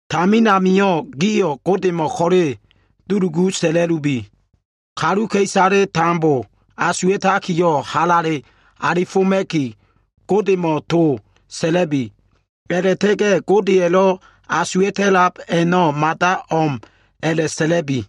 Tamin amio꞉, gio꞉ Godemo꞉ ko꞉le dulugu sa꞉la꞉lubi. Kaluka꞉isaleyo꞉ tambo asuwa꞉takiyo꞉ halale alifoma꞉ki, Godemo꞉ to sa꞉la꞉bi. A꞉la꞉ta꞉ga꞉ Godeya꞉lo꞉ asuwa꞉ta꞉lab a꞉no꞉, mada o꞉m a꞉la꞉sa꞉la꞉bi.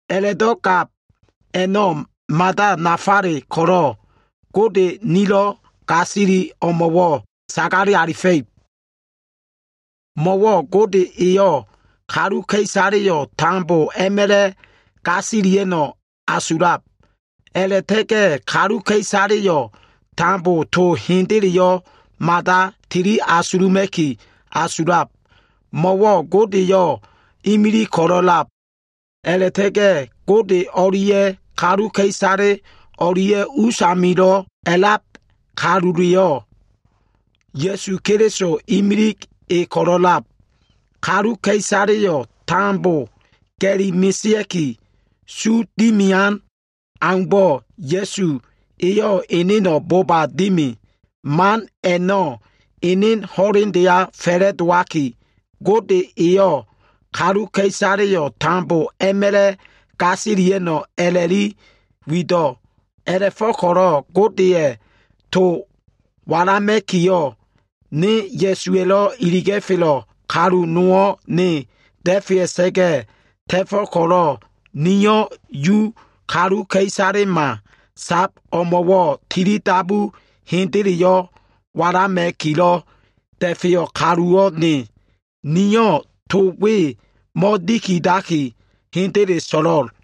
A꞉la꞉do꞉ gab a꞉no꞉ mada nafale ko꞉lo꞉, Gode nilo꞉ gasili o꞉mo꞉wo꞉ sagale alifa꞉ib. Mo꞉wo꞉ Gode eyo꞉ kaluka꞉isale tambo a꞉ma꞉la꞉ gasilia꞉no꞉ asulab. A꞉la꞉ta꞉ga꞉ kaluka꞉isaleyo꞉ tambo to hendeleyo꞉ mada tili asuluma꞉ki asulab. Mo꞉wo꞉ Godeyo꞉ imilig ko꞉lo꞉lab, a꞉la꞉ta꞉ga꞉ Gode o꞉lia꞉ kaluka꞉isale o꞉lia꞉ us amilo꞉ a꞉lab kaluleyo꞉, Ya꞉su Keliso, imilig e ko꞉lo꞉lab. Kaluka꞉isaleyo꞉ tambo ga꞉li mesea꞉ki, su dimian aumbo꞉ Ya꞉su eyo꞉ eneno꞉ boba dimi. Man a꞉no꞉ ene ho꞉lendeya fa꞉la꞉dowaki, Gode eyo꞉ kaluka꞉isaleyo꞉ tambo a꞉ma꞉la꞉ gasilia꞉no꞉ a꞉la꞉li wido꞉. A꞉la꞉fo꞉ko꞉lo꞉ Godeya꞉ to walama꞉kiyo꞉, ne Ya꞉suwa꞉lo꞉ iliga꞉felo꞉ kalu nowo꞉ ne da꞉fea꞉sa꞉ga꞉ ta꞉fo꞉ ko꞉lo꞉, niyo꞉ Yu kaluka꞉isalema sab o꞉mo꞉wo꞉ tilidabu hendeleyo꞉ walama꞉kilo꞉ da꞉feyo꞉ kaluwo꞉ ne. Niyo꞉ to we mo꞉dikidaki, hendele so꞉lo꞉l.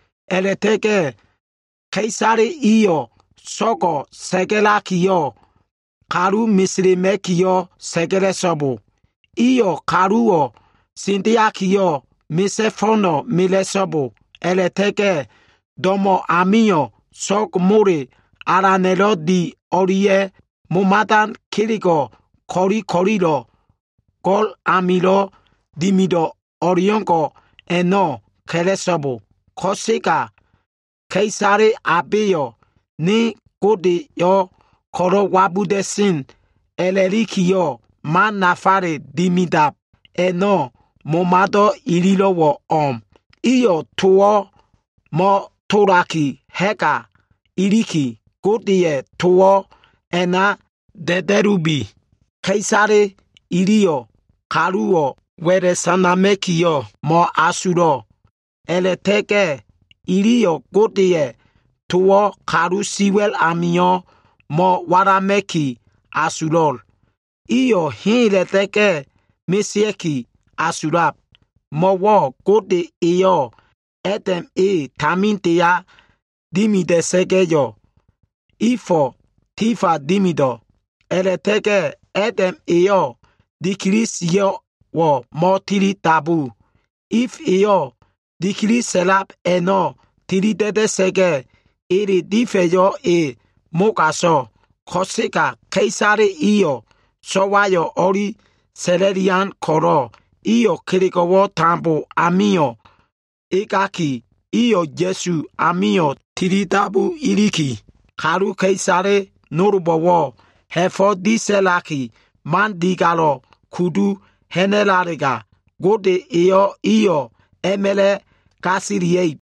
A꞉la꞉ta꞉ga꞉ ka꞉isale iyo꞉ so꞉go꞉ sa꞉ga꞉lakiyo꞉, kalu meselema꞉kiyo꞉ sa꞉ga꞉la꞉so꞉bo. Iyo꞉ kaluwo꞉ sendeakiyo꞉ misa꞉ fo꞉no꞉ mela꞉so꞉bo, a꞉la꞉ta꞉ga꞉ do꞉mo꞉ amio꞉ so꞉g mole alana꞉lo꞉ dian o꞉lia꞉ momadan kelego꞉ ko꞉li ko꞉lilo꞉ go꞉l amilo꞉ dimido꞉ o꞉leo꞉ngo꞉ a꞉no꞉ ka꞉la꞉so꞉bo. Ko꞉sega ka꞉isale abeyo꞉ ne Godeyo꞉ ko꞉lo꞉ wabuda꞉sen a꞉la꞉likiyo꞉, man nafale dimidab a꞉no꞉, momado꞉ ililo꞉wo꞉ o꞉m. Iyo꞉ towo꞉ mo꞉tolaki ha꞉ga iliki, Godeya꞉ towo꞉ a꞉na da꞉da꞉lubi. Ka꞉isale iliyo꞉ kaluwo꞉ wa꞉la꞉ sanama꞉kiyo꞉ mo꞉asulo꞉. A꞉la꞉ta꞉ga꞉ iliyo꞉ Godeya꞉ towo꞉ kalu siwa꞉l amio꞉ mo꞉walama꞉ki asulo꞉l. Iyo꞉ hela꞉ta꞉ga꞉ mesea꞉ki asulab. Mo꞉wo꞉ Gode eyo꞉ Adam e tamindeya dimida꞉sa꞉ga꞉yo꞉, Ifo꞉ tifa dimido꞉. A꞉la꞉ta꞉ga꞉ Adam eyo꞉ dikili sio꞉wo꞉ mo꞉tilidabu. If eyo꞉ dikili sa꞉lab a꞉no꞉ tilida꞉da꞉sa꞉ga꞉, ele difa꞉yo꞉ e mogaso꞉. Ko꞉sega ka꞉isale iyo꞉ so꞉wayo꞉ o꞉li sa꞉la꞉lian ko꞉lo꞉, iyo꞉ kelego꞉wo꞉ tambo i amio꞉ egaki, iyo꞉ Ya꞉su amio꞉ tilidabu iliki, kaluka꞉isale nolbo꞉wo꞉ ha꞉fo꞉ disa꞉laki, man digalo꞉ kudu ha꞉na꞉lalega, Gode eyo꞉ iyo꞉ a꞉ma꞉la꞉ gasilia꞉ib.